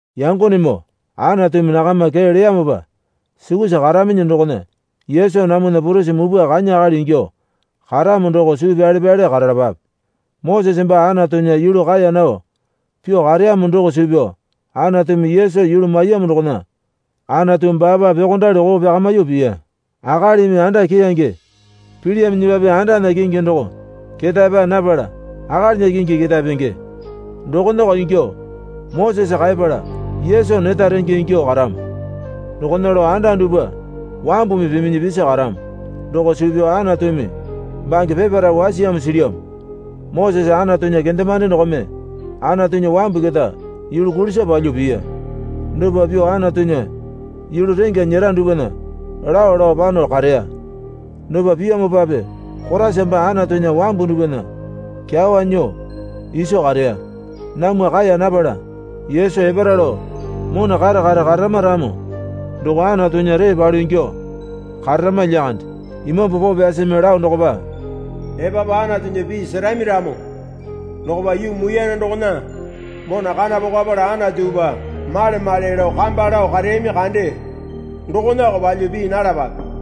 Yangonemoo Anatumi nakama kee leyamopa sukusa karaminyi dokona Yesu namwana Purisi Mupwa kanya akali ingyuo karamo doko suu pyale pyale karalapape. Mosese baa Anatunya yulu kaeya nao pyuo kareyamo doko suu pyao Anatumi Yesu yulu maiyamo dokona Anatu baapa pyuokondali koo pyakamyuo piya. Akalimi anda keyange pilyaminyipape andana kingi doko ketae paa napala akalinya kingi ketae penge. Dokonako ingyuo Mosese kaepala Yesu neta renge ingyuo karamo. Dokona lao anda dupwa wambumi piminyi pisi karamo doko suu pyao Anatumi bange peparae wasiyamo silyamo. Mosese Anatunya kendemande dokome Anatunya wambu keta yulu kulisa palyuo piya. Dopa pyuo Anatunya yulu rengya nyera dupwana lao lao pano kareya. Dopa piyamopape Koraisa baa Anatunya wambu dupwana kyawa nyuo iso kareya. Namwa kaeya napala Yesu epara lao mona kare kare kararama ramo doko Anatunya ree palu ingyuo kararama lyakande. Imambu Poo Pyasimi lao dokopa, Epapu Anatunya pii serami ramo dokopa yuu muiyane dokona mona kana pokapala Anatupa male male lao kamba lao kareyami kande dokonako palyuo pii nalapape.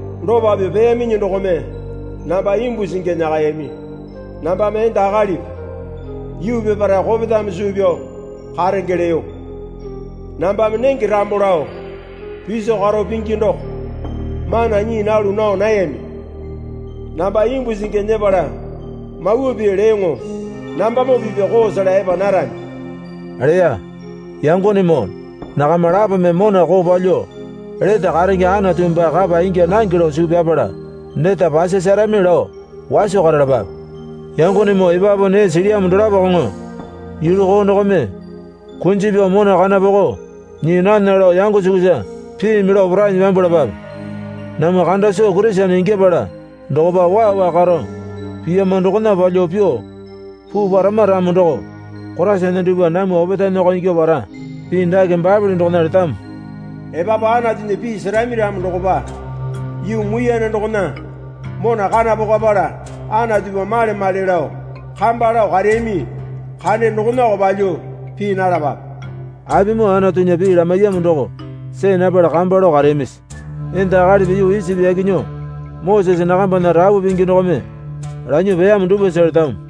Dopa pyuo peyaminyi dokome namba imbu singi nyakayami. Nambame enda akalipi yuu peparae kopetame suu pyao karenge leyo. Nambame nenge rambo lao piso karo pingi doko mana nyii nalu nao nayami. Namba imbu singi nyepala mawa pii leyoŋo nambamoo pipya koo sela epa narami leya. Yangonemoo nakama lapome mona koo palyuo lete karenge Anatu baa kapa ingya nange lao suu pyapala neta pasasarami lao waso karalapape. Yangonemoo epapu nee silyamo dolapokoŋo yulu koo dokome kunji pyao mona kana poko nyii nana lao yango sukusa piimi lao porainyi pyambwalapape. Namwa kanda soo Kurisene ingyapala dokopa waa waa karo piyama dokona palyuo pyuo puu parama ramo doko Koraisana dupwa namwa opetaenako ingyuo para. Pii dake Baepole dokona letamo. Epapu Anatunya pii serami ramo dokopa yuu muiyane dokona mona kana pokapala Anatupa male male lao kamba lao kareyami kande dokonako palyuo pii nalapape. Apimoo Anatunya pii lamaiyamo doko see napala kamba lao kareyamisi? Enda akalipi yuu Isipi yaki nyuo Mosese nakambana rapu pingi dokome lanyuo peyamo dupwasa letamo.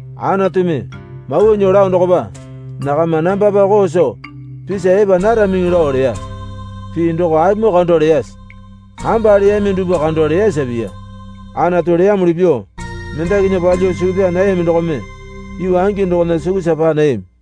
Anatumi mawa nyuo lao dokopa, Nakama nambapa koo soo pisa epa naramiŋi lao leya. Pii doko apimoo kando leyase? Kamba leyami dupwa kando leyasa piya. Anatu leyamuli pyuo mendakinya palyuo suu pyaa nayami dokome yuu angi dokona sukusa paa nayami.